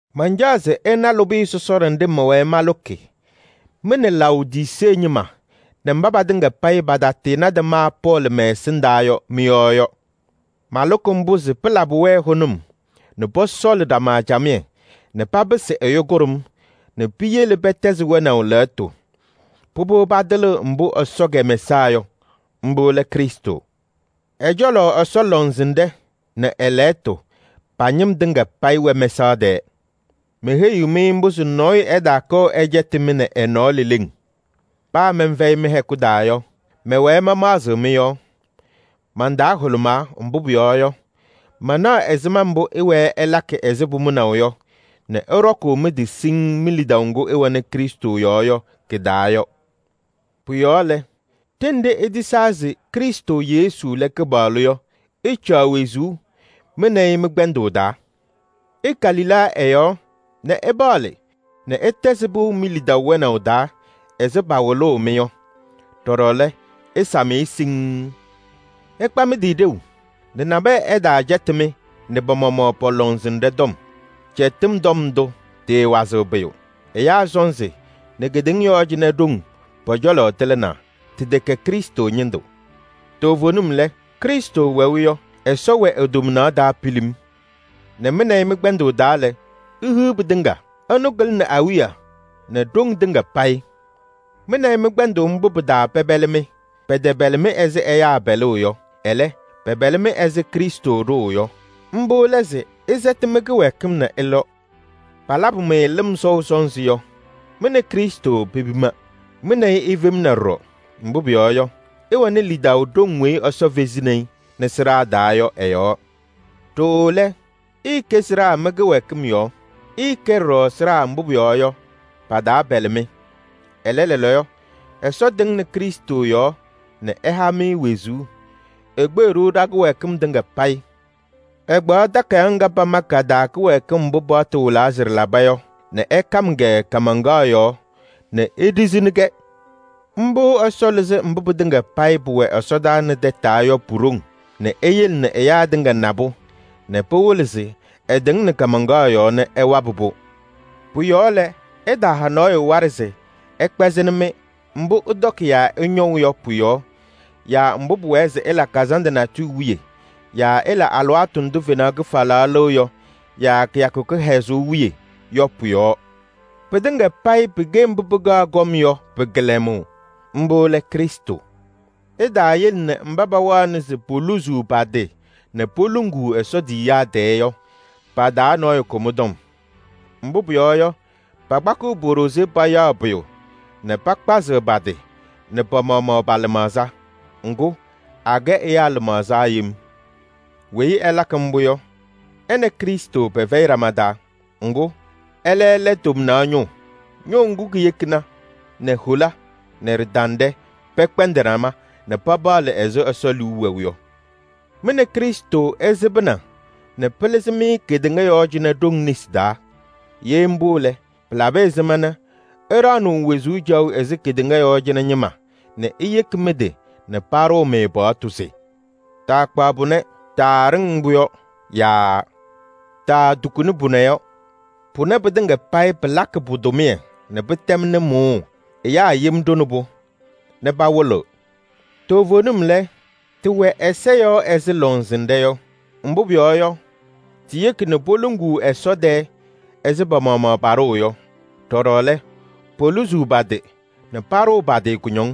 Mancaɣ se ɩna lʋbɩyɛ sɔsɔɖɛ nɖɩ mɛwɛɛ malʋkɩ mɩ nɛ Laodisee ñɩma nɛ mba patɩŋa payɩ patatɩɩnadɩ ma Pɔɔlɩ mɛ-ɛsɩndaa yɔ mɩ-yɔɔ yɔ. Malʋkɩ mbʋ se pɩlabɩ-wɛ hʋnʋm nɛ pɔsɔɔlɩ ɖama camɩyɛ nɛ papɩsɩ ɛyʋ kʋɖʋm nɛ piyele pɛtɛzɩ wɛnaʋ lɛɣtʋ. Pʋbʋ, patɩlɩɣ mbʋ Ɛsɔ kɛmɛsaa yɔ: mbʋ lɛ Krɩstʋ. Ɛ-cɔlɔ Ɛsɔ lɔŋsɩnɖɛ nɛ ɛ-lɛɣtʋ pa-ñɩm tɩŋa payɩ wɛ mɛsaɣ tɛɛ. Meheyiɣ-mɩ mbʋ se nɔɔyʋ ɛtaakɔɔ ɛcɛtɩ-mɩ nɛ ɛ-nɔɔ leleŋ. Paa mɛnfɛyɩ mɩ-hɛkʋ taa yɔ, mɛwɛɛ mamaɣzɩɣ mɩ-yɔɔ. Man-taa hʋlʋmaa, mbʋ pʋyɔɔ yɔ, manaɣ ɛzɩma mbʋ ɩwɛɛ ɩlakɩ ɛzɩ pʋmʋnaʋ yɔ nɛ ɩɖɔkʋʋ mɩ-tɩ siŋŋ mi-lidaʋ ŋgʋ ɩwɛnɩ Krɩstʋ yɔɔ yɔ kɩ-taa yɔ. Pʋ-yɔɔ lɛ, ɖenɖe itisaa se Krɩstʋ Yesu lɛ Kɩpaɣlʋ yɔ, ɩcaɣ wezuu mɩ nɛ ɩ mɩ-kpɛndʋʋ taa. Ɩka lila ɛ-yɔɔ nɛ ɩpaɣlɩ nɛ ɩtɛzɩ pɩʋ mi-lidaʋ wɛnaʋ taa ɛzɩ pawɩlʋʋ-mɩ yɔ. Ɖɔɖɔ lɛ, ɩsam-ɩ siŋŋ. Ɩkpa mɩ-tɩ ɖeu nɛ nabɛyɛ ɛtaacɛtɩ-mɩ nɛ pa-maɣmaɣ pɔ-lɔŋsɩnɖɛ tɔm. Cɛtɩm tɔm ndʋ, tɩɩwazɩɣ pʋyʋ. Ɛyaa sɔnzɩ nɛ kedeŋa yɔɔ cɩnɛ ɖoŋ pɔ-cɔlɔ tɩlɩnaa. Tɩtɛkɛ Krɩstʋ ñɩndʋ. Toovenim lɛ, Krɩstʋ wɛʋ yɔ, Ɛsɔ wɛ e-tomnaɣ taa pilim nɛ mɩ nɛ ɩ mɩ-kpɛndʋʋ taa lɛ, ihiɣ pɩtɩŋa. Ɛnʋ kɩlɩnɩ awiya nɛ ɖoŋ tɩŋa payɩ. Mɩ nɛ ɩ mɩ-kpɛndʋʋ mbʋ pɩ-taa pɛpɛlɩ-mɩ. Pɛtɛpɛlɩ-mɩ ɛzɩ ɛyaa pɛlʋʋ yɔ, ɛlɛ, pɛpɛlɩ-mɩ ɛzɩ Krɩstʋ ɖʋʋ yɔ. Mbʋ lɛ se ɩsɛtɩ mɩ-kɩwɛɛkɩm nɛ ɩlɔ. Palabʋ-mɩ lɩm sɔʋ sɔnzɩ yɔ, mɩ nɛ Krɩstʋ pepima. Mɩ nɛ ɩ ifemna ɖɔɖɔ, mbʋ pʋyɔɔ yɔ, ɩwɛnɩ lidaʋ ɖoŋ weyi Ɛsɔ fezini-i nɛ sɩɖaa taa yɔ ɛ-yɔɔ. Ɖooo lɛ, ɩɩkɛ sɩɖaa mɩ-kɩwɛɛkɩm nɛ mɩ-kɩtɛpɛlɩtʋ pɔ-yɔɔ. Ɛlɛ, lɛɛlɛɛyɔ Ɛsɔ tɩŋnɩ Krɩstʋ yɔɔ nɛ ɛha-mɩ wezuu: ekpeɣ-ɖʋ ɖa-kɩwɛɛkɩm tɩŋa payɩ. Ɛkpaɣ takayaɣ ŋga pama ka-taa kɩwɛɛkɩm mbʋ paɣtʋ wɩlaa se ɖɩlaba yɔ nɛ ɛkam-kɛ kaamaŋkaɣ yɔɔ nɛ eɖizini-kɛ. Mbʋ Ɛsɔ lɩzɩ mbʋ pɩtɩŋa payɩ pʋwɛ ɛsɔdaa nɛ tataa yɔ pu-ɖoŋ nɛ eyele nɛ ɛyaa tɩŋa na-pʋ nɛ pɩwɩlɩ se ɛtɩŋnɩ kaamaŋkaɣ yɔɔ nɛ ɛwabɩ-pʋ. Pʋ-yɔɔ lɛ, ɩtaaha nɔɔyʋ waɖɛ se ɛkpɛzɩnɩ-mɩ mbʋ ɩtɔkɩ yaa ɩñɔʋ yɔ pʋ-yɔɔ yaa mbʋ pʋwɛɛ se ɩla kazandʋ natʋyʋ wiye yaa ɩla alɩwaatʋ ndʋ fenaɣ kɩfalaɣ lɩɣ yɔ yaa kɩyakʋ kɩhɛzʋʋ wiye yɔ pʋ-yɔɔ. Pɩtɩŋa payɩ pɩkɛ mbʋ pɩkaɣ kɔm yɔ pɩ-kɩlɛmʋʋ. Mbʋ lɛ Krɩstʋ. Ɩtaayele nɛ mba pawaɣnɩ se poluzuu pa-tɩ nɛ poluŋuu Ɛsɔ tiyiyaa tɛɛ yɔ, pa-taa nɔɔyʋ kʋ mɩ-tɔm. Mbʋ pʋyɔɔ yɔ, pakpakɩɣ po-ɖozee payaɣ pʋyʋ nɛ pakpazɩɣ pa-tɩ nɛ pa-maɣmaɣ pa-lɩmaɣza. Ŋgʋ, akɛ ɛyaa lɩmaɣza yem. Weyi ɛlakɩ mbʋ yɔ, ɛ nɛ Krɩstʋ pɛfɛyɩ ɖama taa. Ŋgʋ, ɛlɛ lɛ tomnaɣ ñʋʋ. Ŋgʋ yekina nɛ hola nɛ ɖɩtanɖɛ pɛkpɛndɩ ɖama nɛ papaɣlɩ ɛzɩ Ɛsɔ liu wɛʋ yɔ. Mɩ nɛ Krɩstʋ ɩsɩbɩna nɛ pɩlɩzɩ-mɩ kedeŋa yɔɔ cɩnɛ ɖoŋ nesi taa. Ye mbʋ lɛ, pɩlabɩ ɛzɩma nɛ ɩɖaɣnɩɣ wezuu caɣʋ ɛzɩ kedeŋa yɔɔ cɩnɛ ñɩma nɛ iyeki mɩ-tɩ nɛ paɖʋʋ-mɩ paɣtʋ se: “Taakpaɣ pʋnɛ?” “Taaɖɩŋ mbʋ yɔ?” Yaa “Taatukuni pʋnɛ yɔ?” Pʋnɛ pɩtɩŋa payɩ, palakɩnɩ-pʋ tʋmɩyɛ nɛ pɩtɛmnɩ mʋʋʋ. Ɛyaa yem ɖʋnɩ-pʋ nɛ pawɩlɩɣ. Toovenim lɛ, tɩwɛ ɛza yɔɔ ɛzɩ lɔŋsɩnɖɛ yɔ. Mbʋ pʋyɔɔ yɔ, tiyeki nɛ poluŋuu Ɛsɔ tɛɛ ɛzɩ pa-maɣmaɣ paɖʋʋ yɔ. Ɖɔɖɔ lɛ, poluzuu pa-tɩ nɛ paɖʋʋ pa-tɩ kʋñɔŋ.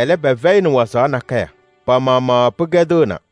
Ɛlɛ, pɩfɛyɩnɩ wazaɣ nakɛyɛ, pa-maɣmaɣ pɩkɛdɩɣna.